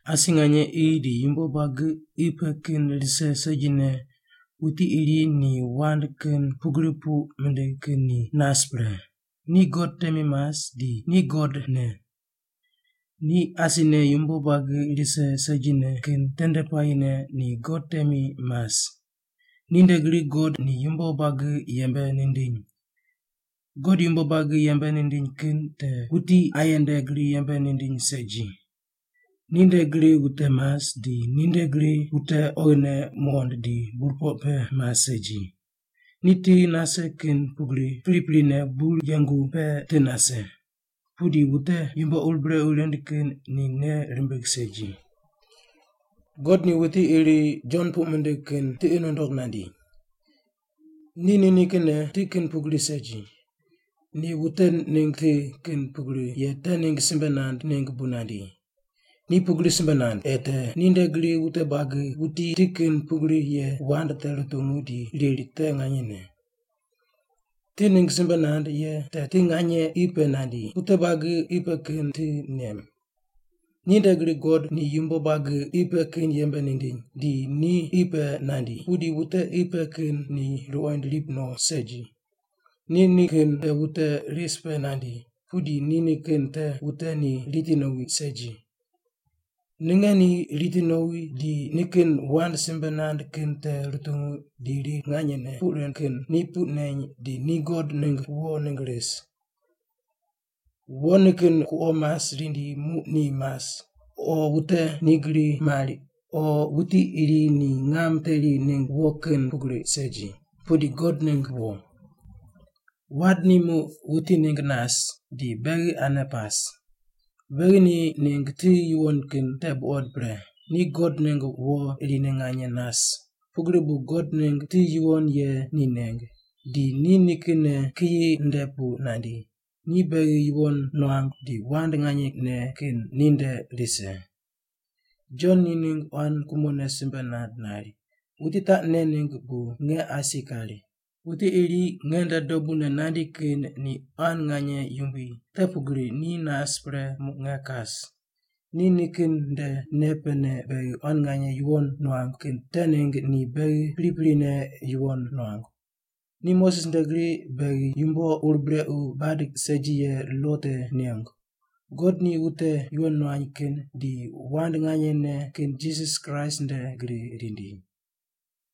Asi nganye qi di yumbo buagi qi pe kin rise segine wuti iri ni wand kin pugri puq mindig kin ni nas pre, ni God temi mas, di ni God ne. Ni asine yumbo buagi rise segine kin tende puayine ni God temi mas. Ninde gri God ni yumbo buagi yembe nindiny. God yumbo buagi yembe nindiny kin te wuti aye nde gri yembe nindiny segi. Ninde gri wute mas, di ninde gri wute oghine muqond di burpoq pe mas segi. Ni ti nase kin pugri priprine bur yengu pe ti nase, pudi wute yumbo ur brequ rind kin ni nei rimbig segi. God ni wuti iri Jon puq mindig kin tiqi nundog nandi. Ni nikinne ti kin pugri segi. Ni wute ningg ti kin pugri ye te ningg simbe nand ningg bu nandi. Ni pugri simbe nand, ei te ninde gri wute buagi wuti ti kin pugri ye wand te rutungu di riri te nganyene. Ti ningg simbe nand ye te ti nganye qi pe nandi, wute buagi qi pe kin ti nem. Ninde gri God ni yumbo buagi qi pe kin yembe nindiny, di ni qi pe nandi, pudi wute qi pe kin ni ruqoind rip no segi. Ni nikin te wute ris pe nandi, pudi ni nikin te wute ni riti nowi segi. Ninge ni riti nowi di nikin wand simbe nand kin te rutungu di riri nganyene puq rind kin ni puq neny di ni God ningg wo ningg ris. Wo nikin kuqo mas rindi muq ni mas, o wute ni gri mari, o wuti iri ni ngam teri ningg wo kin pugri segi, pudi God ningg wo. Wand ni muq wuti ningg nas, di beghi ane pas. Beghi ni ningg ti yuwon kin te buqod pre, ni God ningg wo irine nganye nas, pugri bu God ningg ti yuwon ye ni neng, di ni nikinne kiyi nde pu nandi, ni beghi yuwon nuangu, di wand nganyene kin ninde rise. Jon ni ningg quan kumone simbe nand nari, “Wuti taq nen ningg bu nge asi kari, ‘Wuti iri nge nde dobune nandi kin ni quan nganye yumbui, te pugri ni nas pre muq nge kas’.” Ni nikin nde nei pene beghi quan nganye yuwon nuangu kin te ningg ni beghi priprine yuwon nuangu. Ni Moses nde gri beghi yumbo ur brequ bad segi ye lo te nengu. God ni wute yuwon nuany kin di wand nganyene kin Jisas Kraist nde gri rindi.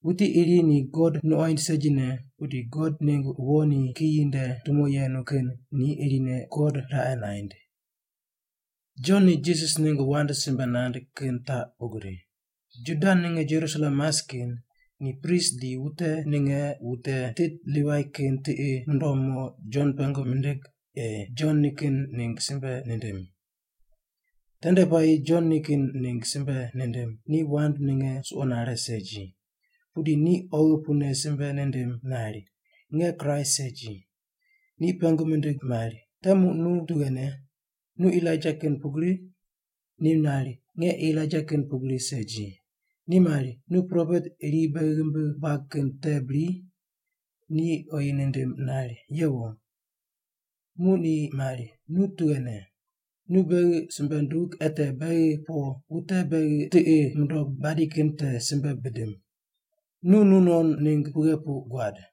Wuti iri ni God nuqoind segine, pudi God ningg wo ni kiyi nde tumo yenu kin ni irine God raqe naind. Jon ni Jisas ningg wand simbe nand kin taq pugri. Juda ninge Jerusalem mas kin, ni prist di wute ninge wute tit Livai kin tiqi mundom mo Jon pengu mindig ei Jon nikin ningg simbe nindim. Tende puayi Jon nikin ningg simbe nindim. Ni wand ninge suqo nare segi, pudi ni oghi pune simbe nindim nari, “Nge Kraist segi.” Ni pengu mindig mari, “Te muq nu tughene? Nu Elaija kin pugri?” Ni nari, “Nge Elaija kin pugri segi.” Ni mari, “Nu propet iri beghi ghimbi buag kin te bri?” Ni oyi nindim nari, “Yewo.” Muq ni mari, “Nu tughene? Nu beghi simbe ndug, ei te beghi po wute beghi tiqi mundog badi kin te simbe bidim. Nu nu non ningg pughe puq guad?”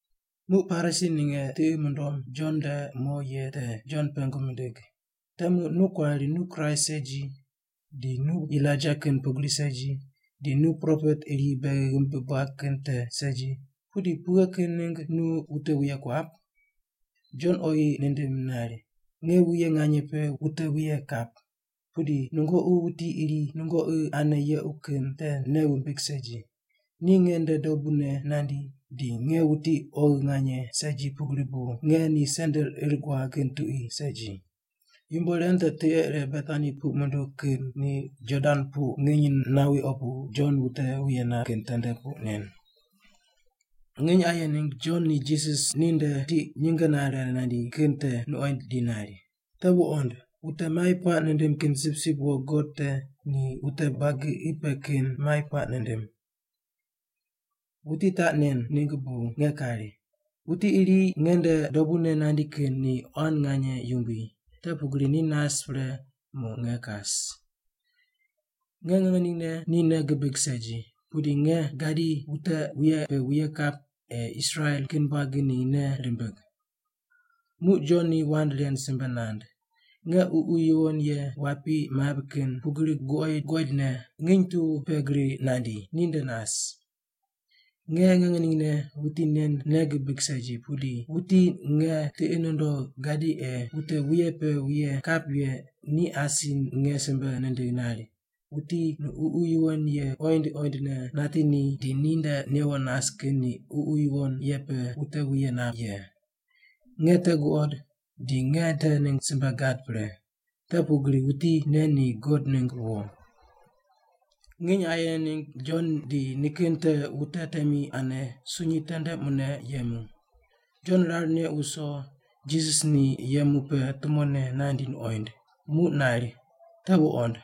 Muq Parisi ninge tiqi mundom Jon nde mo ye te Jon pengu mindig, “Te muq nu kuari nu Kraist segi, di nu Elaija kin pugri segi, di nu propet iri beghi ghimbi buag kin te segi, pudi pughe kin ningg nu wute wuye kuap?” Jon oyi nindim nari, “Nge wuye nganye pe wute wuye kap. Pudi nungoqi wuti iri nungoqi ane yequ kin te nei wumbig segi. Ni nge nde dobune nandi, di nge wuti oghi nganye segi pugri bu nge ni sendel ir guag kin tuqui segi.” Yumbo ren te tiqe ire Betani puq munduw kin ni Jordan pu nginy nawi opu Jon wute wuye nap kin tende puq men. Nginy aye ningg Jon ni Jisas ni nde tiq nyinge nare nandi kin te nuqoind di nari, “Te wuqond. Wute mai puaq nindim kin sipsip wo God te ni wute buagi qi pe kin mai puaq nindim! Wuti taq nen ningg bu nge kari, ‘Wuti iri nge nde dobune nandi kin ni quan nganye yumbui, te pugri ni nas pre muq nge kas.’ Nge ngeningne ni nei gibig segi. Pudi nge gadi wute wuye pe wuye kap ei Israel kin buagi ni nei rimbig.” Muq Jon ni wand ren simbe nand, “Nge Ququ Yuwon Ye wapi mabri kin pugri guqoid guqoidne nginy tu pe gri nandi, ni nde nas. Nge ngeningne wuti nen nei gibig segi, pudi wuti nge tiqi nundogh gadi ei wute wuye pe wuye kap ye ni asi nge simbe nindigh nari, ‘Wuti nu Ququ Yuwon Ye qoind qoindne nati ni di ni nde newo nas kin ni Ququ Yuwon Ye pe wute wuye nap ye.’ Nge te guqod di nge te ningg simbe gad pre, te pugri wuti nen ni God ningg wo.” Nginy aye ningg Jon di nikin te wute temi ane sunyi tendene mune yemu. Jon rar neq wuso, Jisas ni yemu pe tumone nandi nuqoind, muq nari, “Te wuqond.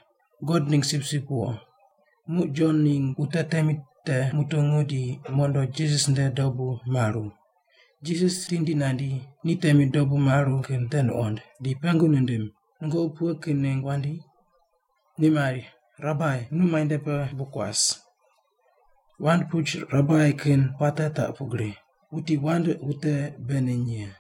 God ningg sipsip wo.” Muq Jon ningg wute temi te mutungu di mondo Jisas nde dobu maru. Jisas tindi nandi, ni temi dobu maru kin te nuqond, di pengu nindim, “Nungoqi pughe kin ningg wandi?” Ni mari, “Rabai, nu muainde pe bu kuas?” (Wand puch Rabai kin puate taq pugri, wuti wand wute bei neny ye.)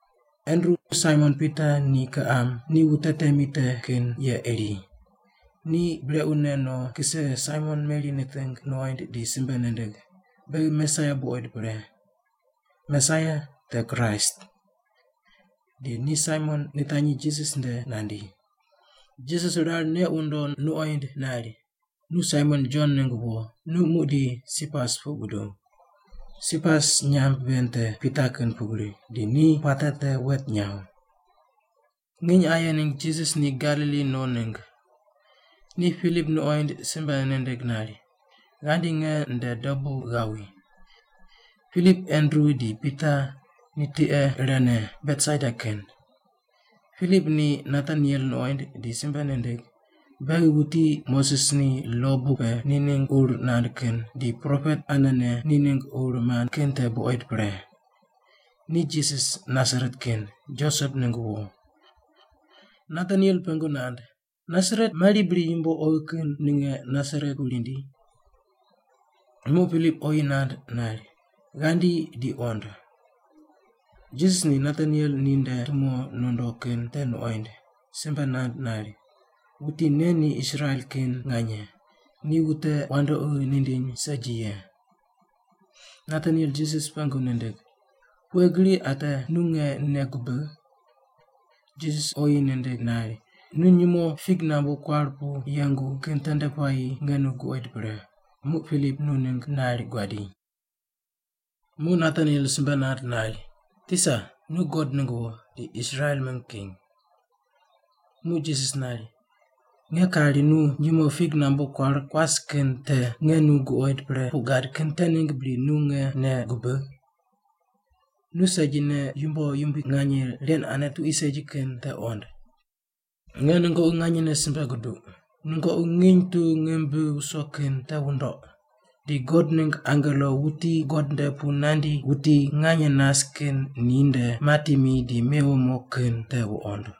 Andru, Saimon Pita ni kiqam, ni wute temi te kin ye iri. Ni brequne no kise Saimon meri niting nuqoind, di simbe nindig, “Beghi Mesaia buqoid pre.” (Mesaia te Kraist.) Di ni Saimon nitanyi Jisas nde nandi. Jisas rar neq wundo nuqoind nari, “Nu Saimon Jon ningg wo. Nu muqdi Sipas puq buduw.” (Sipas nyamb ven te Pita kin pugri, di ni puate te wet nyaw.) Nginy aye ningg Jisas ni Galili no ningg. Ni Pilip nuqoind, simbe nindig nari, “Ghandi nge nde dobu ghawi.” Pilip, Andru di Pita ni tiqe irene, Betsaida kin. Pilip ni Nataniel nuqoind di simbe nindig, “Beghi wuti te Moses ni lo buk pe ni ningg ur nand kin, di propet anene ni ningg ur mand kin te buqoid pre. Ni Jisas, Nasaret kin, Josep ningg wo.” Nataniel pengu nand, “Nasaret! Mari bri yumbo oghi kin ninge Nasaret pu rindi?” Muq Pilip oyi nand nari, “Ghandi di qond.” Jisas ni Nataniel ni nde tumo nondo kin te nuqoind, simbe nand nari, “Wuti nen ni Israel kin nganye, ni wute wandoqi nindiny segi ye.” Nataniel Jisas pengu nindig, “Pughe gri ate nu nge nei gubigh?” Jisas oyi nindig nari, “Nu nyumo fig nambu kuar pu yengu kin tende puayi nge nu guqoid pre, muq Pilip nu ningg nari guadi.” Muq Nataniel simbe nand nari, “Tisa. Nu God ningg wo, di Israel mingg king.” Muq Jisas nari, “Nge kari nu nyumo fig nambu kuar kuas kin te nge nu guqoid pre puq gad kin te ningg bri nu nge nei gubigh? Nu segine yumbo yumbui nganye, ren ane tuqui segi kin te qond. Nge nungoqi nganyene simbe guduq, nungoqi nginy tu ngim bi wuso kin te wundoq, di God ningg angelo wuti God nde pu nandi wuti nganye nas kin ni nde mati mi di mewo mo kin te wuqond.”